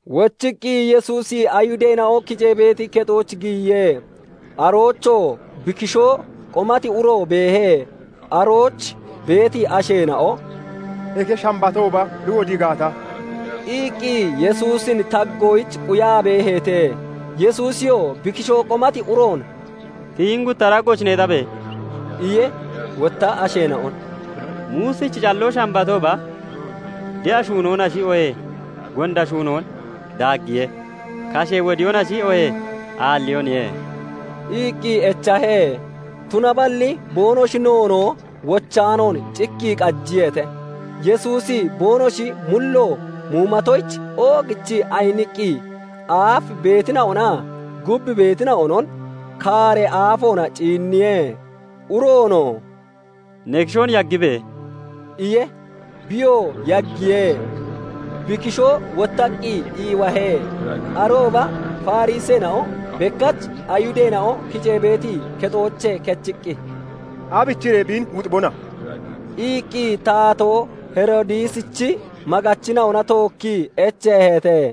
Wochiqqi Yesuusi Ayihudeena'o kicee beeti kexooch giyiye. Aroochoo bi kishoo qomati uro beehe. Arooch beeti asheena'o "Eke Shambatooba bi wodii gaata..." iqqi Yesuusin taggoyich quyaa beeheete. Yesuusiyoo bi kishoo qomati uroon "Tiyi hini gutta daggooch neexabe!" iye. Wotta asheena'on "Muusichi calloo Shambatooba de'a shuunoonashi, oohee gonda shuunoon daaggiye? Kashee wodiyoonashi, oohee aalliyooniye?" iqqi echahe; tunaballi boonoshi noonoo wochaanoon cikkii qajiyeete. Yesuusi boonoshi mullo muumatoyich oogichii ayiniqqi aaf beetina'onaa gub beetina'onon kaaree aafoona ciinniye. Uroonoo "Ne kishoon yaggibe!" iye. Biyoo yaggiye; bi kishoo wottaqqi iiwahe. Arooba Fariseena'o bekkach Ayihudeena'o kicee beeti kexoochee kechiqqi, "Aabichiree biin wuxibona?" iqqi taatoo Heroodisichi maggachina'ona tookkii echeeheete.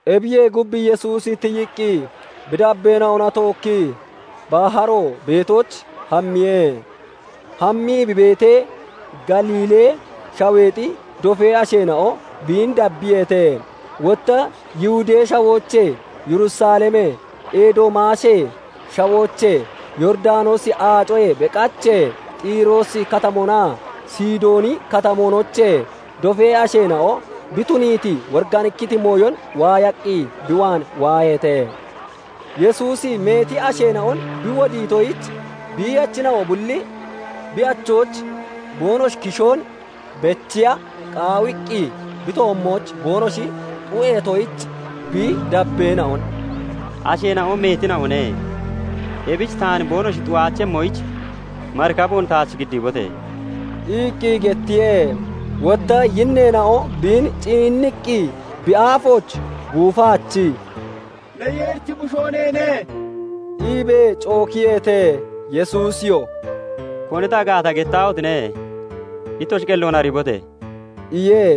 Ebiyee gub, Yesuusi tiyiqqi bi dabbeena'ona tookkii baharo beetooch hammiye. Hammii bi beetee, Galiilee Shaweexi dofee asheena'o biin dabbiyeete; wotta Yihudee Shawoochee, Yerusalemee, Edoomaashee shawoochee, Yooridanoosi Aacoyee beqachee, Xiroosi Katamoonaa Sidooni Katamoonoochee dofee asheena'o bi tuniiti woriganikkiti mooyon waayaqqi bi waan waaheete. Yesuusi meeti asheena'on bi wodiitoyich biiyachina'o bulli bi achooch boonoshi kishoon bechiya qaawiqqi bi toommooch boonoshi xu'eetoyich, bi dabbeen'on "Asheena'o meetina'one; ebich taan boonoshi xu'Aachemmoyich marikaboon taach giddiibote!" iqqi gettiye. Wotta yinneena'o biin ciinniqqi bi aafooch guufaachii, "Ne Yeerichi Bushoo neene" iibee cookiyeete. Yesuusiyoo "Koni ta gaata gettaahotine! Ittoshi qelloon ariibote!" iye.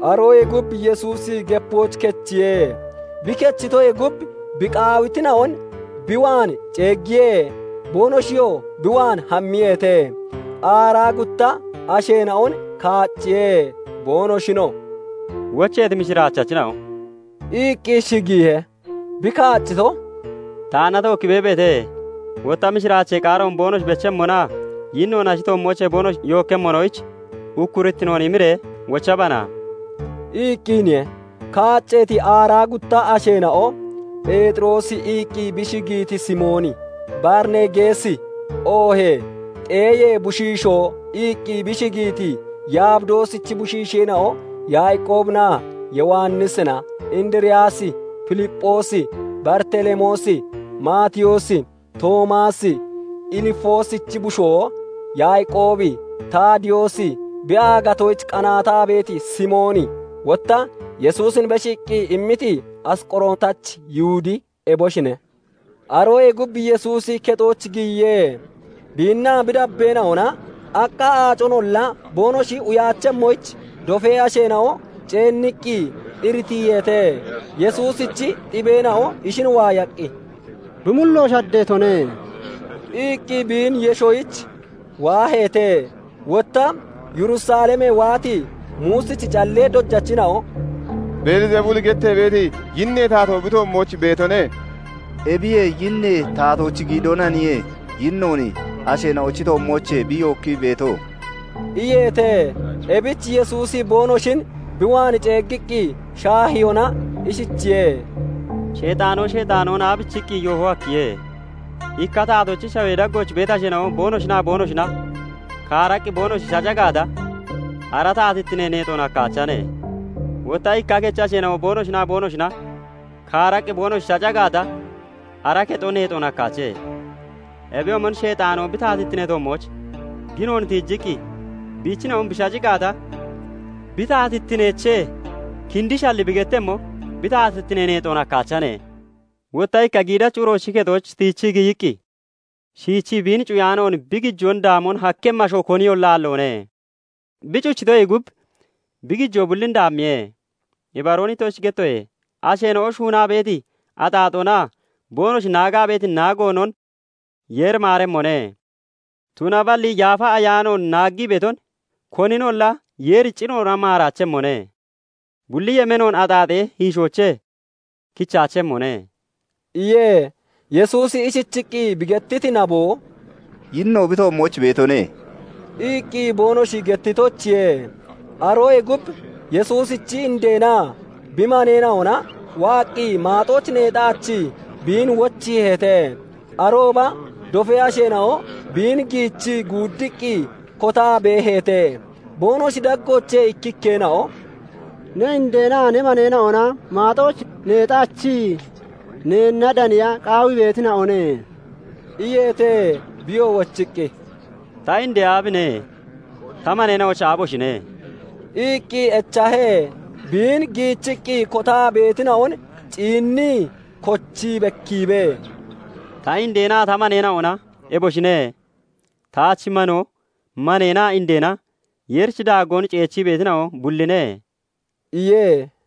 Aroyee gub Yesuusi gepooch kechiye. Bi kechitoyee gub bi qaawitina'on bi waan ceeggiye; boonoshiyoo bi waan hammiyeete. Aaraa gutta asheena'on kaacciye; [boonoshinoo "Wocheeti mishiraachachina'o" iqqi shigiihe.] Bi kaaccito, "Taanna tookkii beebeete; wotta mishiraachee qaaroon boonoshi bechemmonaa yinnoon ashi toommoochee boonoshi yookkemmonoyich ukkurittinoon imiree wochabana" iqqiniye. [Kaacceeti aaraa gutta asheena'o] "Pheexiroosi" iqqi bi shigiiti Simooni, "Baarinegeesi" oohee "Xeeyee bushiishoo" iqqi bi shigiiti Yabidoosichi bushiisheena'o Yaaqoobinaa Yowannisina, Indiriyaasi, Filipphoosi, Baritelemoosi, Maatiyoosi, Toomaasi, Ilfoosichi bushoo Yaaqoobi, Taadiyoosi, bi aagatoyich qanaataa beeti Simooni, Wotta Yesuusin beshiiqqi immiti Asqorotachi Yihudi eboshine. Aroyee gub Yesuusi kexooch giyiye. Biinnaa bi dabbeena'ona aqqa aaconolla boonoshi uyaachemmoyich dofee asheena'o ceenniqqi iritiiheete. Yesuusichi xibeena'o ishin waayaqqi, "Bi mullo shaddeetone" iqqi biin yeshoyich waaheete. Wotta Yerusalemee waati Muusichi callee dojachina'o "Beelzebuli gettee beeti yinnee taatoo bi toommooch beetone. 'Ebiyee yinnee taatoochi giidoonaniye yinnoon asheena'ochi toommoochee bi yookkii beeto" iyeete. Ebich Yesuusi boonoshin bi waan ceeggiqqi shaahiyoona ishichiye:- "Sheexaano Sheexaanoon aabichiqqi yoohon hakkiye? Ikka taatoochi shawee daggooch beeti asheena'o boonoshinaa boonoshina kaaraqqi boonoshi shaca gaata, ara taatittinee neexoon hakkaachane. Wotta ikka kechi asheena'o boonoshinaa boonoshina kaaraqqi boonoshi shaca gaata, ara kexo neexoon hakkaache. Ebiyoomon Sheexaano bi taatittinee toommooch ginoon tiijiqqi biichina'on bi shaci gaata, bi taatittineechee kindishalli bi gettemmo bi taatittine neexoon hakkaachane. Wotta ikka giidachi uroochi kexon tiichii giyiqqi shiichii biin cuyaanoon bi gijoon daamon hakkemmi asho koniyolla aalloone. Bi cuchitoyee gub bi gijoo bullin daammiye. Ibaroon ittoshich gettoye; asheena'o shuunaa beeti axaaxoonaa boonoshi naagaa beeti naagoonon Yeeri maaremmone; Tunaballi Yaafa Ayaanoon naaggii beeton koninolla Yeeri ciroona maaraachemmone; bulli yemeenoon axaaxee hiishoochee kichaachemmone" iye. Yesuusi ishichiqqi bi gettiti nabo, "Yinno bi toommooch beetone" iqqi boonoshi gettitoyichiye. Aroyee gub Yesuusichi indeenaa bi maneena'ona waaqqi maaxooch neexaachii biin wochiiheete. Arooba dofee asheena'o biin giichii guuddiqqi kotaa beeheete. Boonoshi daggoochee ikkikkeena'o "Ne indeenaa ne maneena'ona maaxooch neexaachii neenna daniya qaawii beetina'one" iyeete. Biyoo wochiqqi, "Ta indee aabine? Ta maneena'ochi aaboshine?" iqqi echahe. Biin giichiqqi kotaa beetina'on ciinnii kochii bekkiibee, "Ta indeenaa ta maneena'ona eboshine! Taach manoo, maneenaa indeena Yeerichi daaggoon ceechii beetina'o bulline" iye.